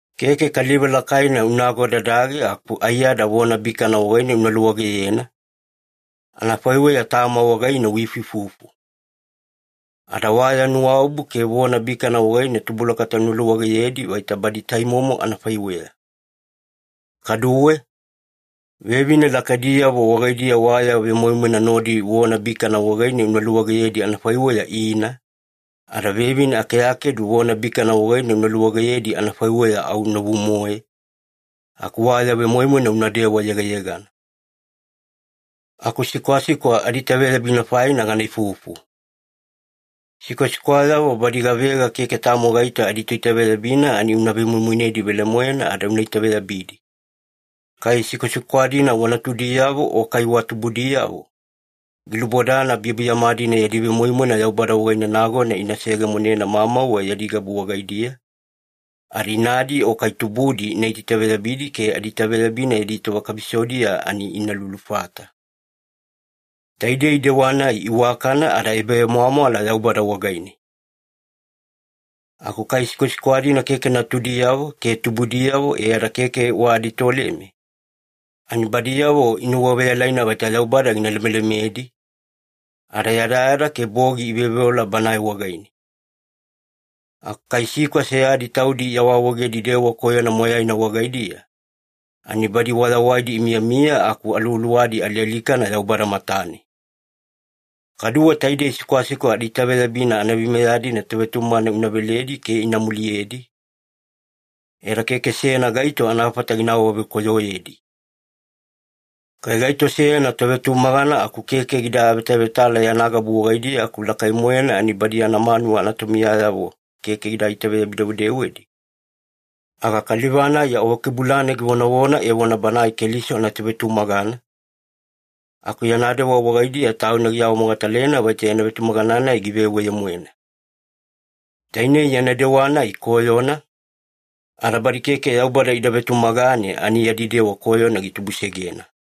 Keke kaliva lakaina una agodadage aku aiyada vona bikana wagaine una luwageyena, anafaiweya tama wagaine uifuifufu. Ada wa ya nuwaobu ke vona bikana wagaine tubulakata una luwageyedi vaita badi taimomo anafaiweya. Kaduwe, vevine lakaidiyavo wagaidiya wa ya vemoimoina nodi vona bikana wagaine una luwageyedi anafaiweya ina, ada vevine akeakedu vona bikana wagaine una luwageyedi anafaiweya au novu-moe, aku wa ya vemoimoina unadewa yegayegana. Aku sikwasikwa adiitaveyabina faina gana ifufu. Sikwasikwayavo badi gavega keke tamo gaito aditoitaveyabina, ani una vemoimoinedi velemoena ada una itaveyabidi. Kai sikwasikwa-dina wa natudiyavo o kai wa tubudiyavo, gilubodana biyabiyama-dina yadi vemoimoina Yaubada wagaine nagona ina seyegemonena mamauwe yadi gabu wagaidiya, ada inadi o kai tubudi ina itaitaveyabidi ke adiitaveyabina yadi tova kabisodiya ani ina lulufata. Taidei dewa-nai iwakana ada ebavemwamwala Yaubada wagaine. Aku kai sikwasikwa-dina keke natudiyavo ke tubudiyavo e ada keke wa aditoleme, ani badiyavo inuwaveyalaina vaita Yaubada gina lemelemedi, ada yadayada ke bogi iveoveola Banae wagaine. Aku kai sikwa seyadi taudi iawaawaegedi dewa koyona moyaina wagaidiya, ani badi wayawaidi imiyamiya aku aluwaluwadi alialikana Yaubada matane. Kaduwe taidei sikwasikwa adiitaveyabina anaveimeya-dina tovetumagana una veledi ke ina muliyedi, e ada keke seyana gaito anafata gina awavekoyoyedi. Kai gaito seyana tovetumagana aku keke gida avetavetala yana gabu wagaidiya aku lakai-moena ani badi yana manuwa anatomiyayavo keke gida itaveyabi-dewedewedi, aga kaliva-nai awakebulane givonavona evona banae Keliso anatovetumagana, aku yana dewa wagaidiya tauna giawamogatalena vaita yana vetumagana-nai giveweye-moena. Tainei yana dewa-nai koyona, ada badi keke Yaubada ida vetumagane ani yadi dewa koyona gitubusegena.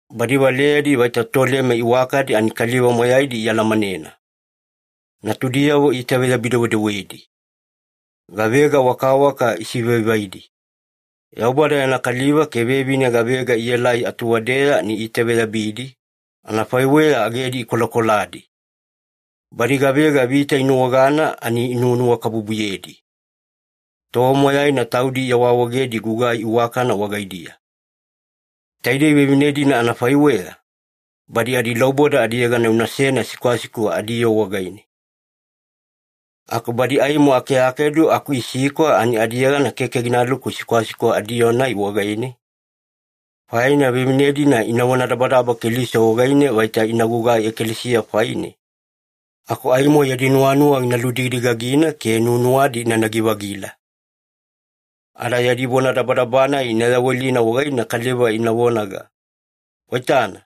Badi valeyadi vaita toleme iwakadi ani kaliva moyaidi ialamanena. Natudiyavo iitaveyabi-dewedewedi. Gavega wakawaka isivaivaidi. Yaubada yana kaliva ke vevine gavega ielai atuwadeya ani iitaveyabidi, anafaiweya agedi ikolakoladi. Badi gavega vita inuwagana ani inuwanuwakabubuyedi. Tova moyaina taudi iawaawaegedi gugai iwakana wagaidiya. Taidei vevine-dina anafaiweya, badi adilauboda adiyegana unasena sikwasikwa adiyoo wagaine. Aku badi aimo akeakedu aku isikwa ani adiyegana keke ginaluku sikwasikwa adiyoo-nai wagaine, faina vevine-dina ina vonadabadaba Keliso wagaine vaita ina gugai ekalesiya faine, aku aimo yadi nuwanuwa gina ludigadigagina ke nuwanuwadi inanagi-vagila. Ada yadi vonadabadaba-nai ina yawelina wagaine kaliva ina vonaga, “Waitana,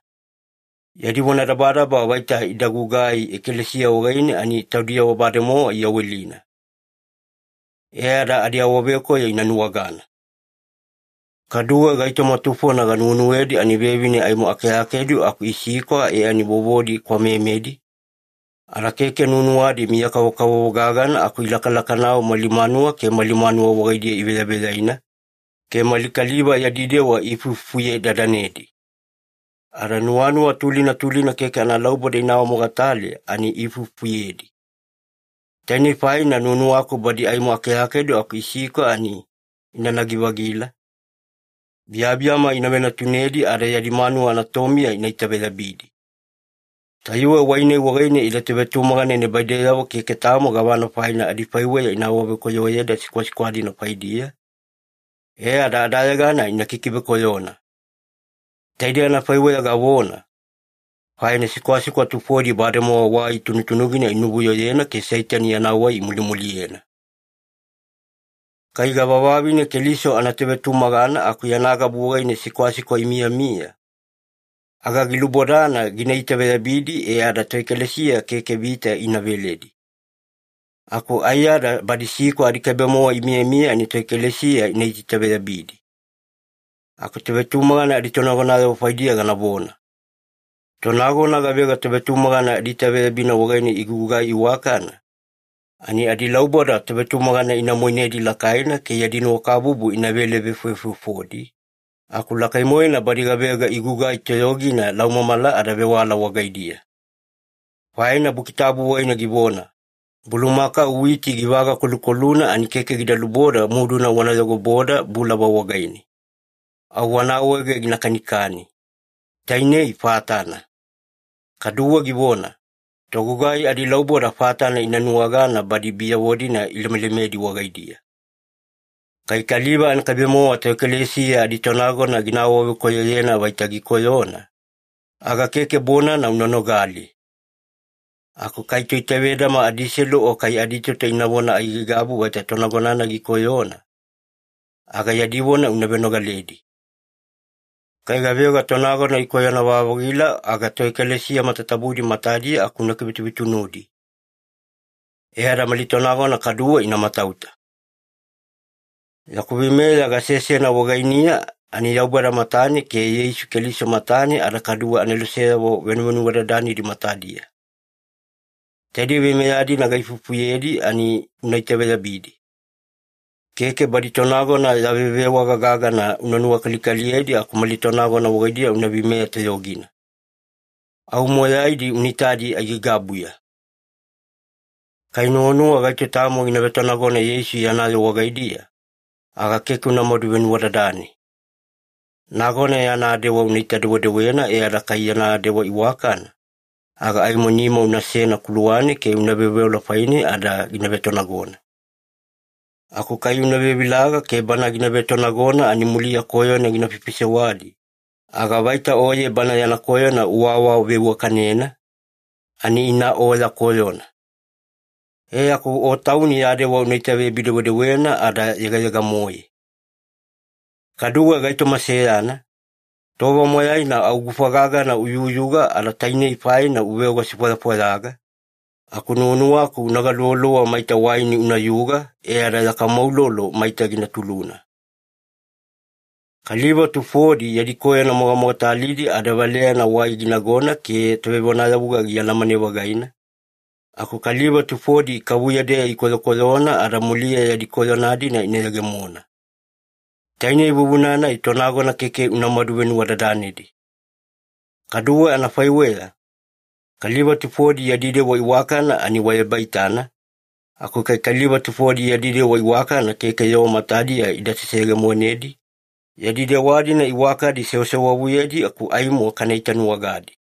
yadi vonadabadaba vaita ida gugai ekalesiya wagaine ani taudiyavo bademowa iyawelina.” E ada adiawavekoyo ina nuwagana. Kaduwe gaitoma tufona ganuwenuwedi ani vevine aimo akeakedu aku isikwa e ani vovodi kwamemedi, ada keke nuwanuwadi miya-kavokavovo gagana aku ilakalakanau mali manuwa ke mali manuwa wagaidiya iveyaveyaina, ke mali kaliva yadi dewa iifuifufuye-dadanedi. Ada nuwanuwa tulina tulina keke analauboda ina awamogatale ani iifuifufuyedi. Tainei faina nuwanuwaku badi aimo akeakedu aku isikwa ani inanagi-vagila, biyabiyama ina venatunedi, ada yadi manuwa anatomiya ina itaveyabidi. Tayuwe wai-nai wagaine ide tovetumagana nibaideyavo keke tamo gavana faina adifaiweya ina awavekoyoyeda sikwasikwa-dina faidiya, e ada adayegana ina kikivekoyona. Taidei anafaiweya gavona, faina sikwasikwa tufodi bademowa wai tunutunugina inuvuyoyena ke Seitani yana wai imulimuliyena. Kai gavavavine Keliso anatovetumagana aku yana gabu wagaine sikwasikwa imiyamiya, aga gilubodana gina itaveyabidi e ada toekalesiya keke vita ina veledi. Aku aiyada badi sikwa adikaibe-mowa imiyamiya ani toekalesiya ina itaitaveyabidi. Aku tovetumagana aditonagonayavo faidiya ganavona. Tonagona gavega tovetumagana adiitaveyabina wagaine igugugai iwakana, ani adilauboda tovetumagana ina moinedi lakaina ke yadi nuwakabubu inavele-vefovefofodi, aku lakai-moena badi gavega igugai toyogina laumamala ada vewala wagaidiya. Faina Buki Tabu wagaine givona, “Bulumakau witi givagakolukoluna ani keke gida luboda muduna wana yogoboda bulava wagaine. Au wana awaege gina kanikani. Tainei fatana.” Kaduwe givona, “Togugai adilauboda fatana ina nuwagana badi biyavo-dina ilemelemedi wagaidiya.” Kai kaliva anakaibe-mowa toekalesiya aditonagona gina awavekoyoyena vaita gikoyona, aga keke bonana una nogali. Aku kai toitavedama adiselu o kai aditoto inavona aigaigabu vaita tonagona-nai gikoyona, aga yadi vona una venogaledi. Kai gavega tonagona ikoyona-vavagila, aga toekalesiya matatabudi matadiya aku una kivetuvetunudi. E ada mali tonagona kaduwe ina matauta. Yaku veimeya gasesena wagainiya ani Yaubada matane ke Yeisu Keliso matane ada kadu yana aneloseyavo venuvenuwadadanidi matadiya. Taidei veimeya-dina gaifufuyedi ani una itaveyabidi. Keke badi tonagona ya vevewaga gagana una nuwakalikaliyedi aku mali tonagona wagaidiya una veimeya toyogina. Au moyaidi una itadi aigaigabuya. Kai nuwanuwa gaito tamo gina vetonagona Yeisu yana yoo wagaidiya, aga keke unamadu venuwadadane. Nagona yana dewa unaita-dewedewena e ada kai yana dewa iwakana, aga aimo nima unasena kuluwane ke una veoveola faine ada gina vetonagona. Aku kai una vevilaga ke bana gina vetonagona ani muliya koyona gina faifaisewadi, aga vaita oye bana yana koyona uawaveiwakanena, ani ina o ya koyona. E aku o tauni ya dewa una itaveyabi-dewedewena ada yegayega-moe. Kaduwe gaitoma seyana, tova moyaina au gufa gagana uyuyuga ada tainei faina uveoga sifwayafwayaga, aku nuwanuwaku una galuvaluva maita waini unayuga e ada ya kamo ulolo maita gina tuluna. Kaliva tufodi yadi koyona mogamogatalidi ada valeyana wai ginagona ke tovevonayavuga gialamane-vagaina, aku kaliva tufodi ikavuya-deya ikoyokoyona ada muliya yadi koyona-dina ina yegemona. Tainei vuvuna-nai tonagona keke unamadu venuwadadanedi. Kaduwe anafaiweya, kaliva tufodi yadi dewa iwakana ani wa ebaitana, aku kai kaliva tufodi yadi dewa iwakana keke yoo matadiya ida seseyegemonedi, yadi dewa-dina iwakadi sewasewavuyedi aku aimo kana itanuwagadi.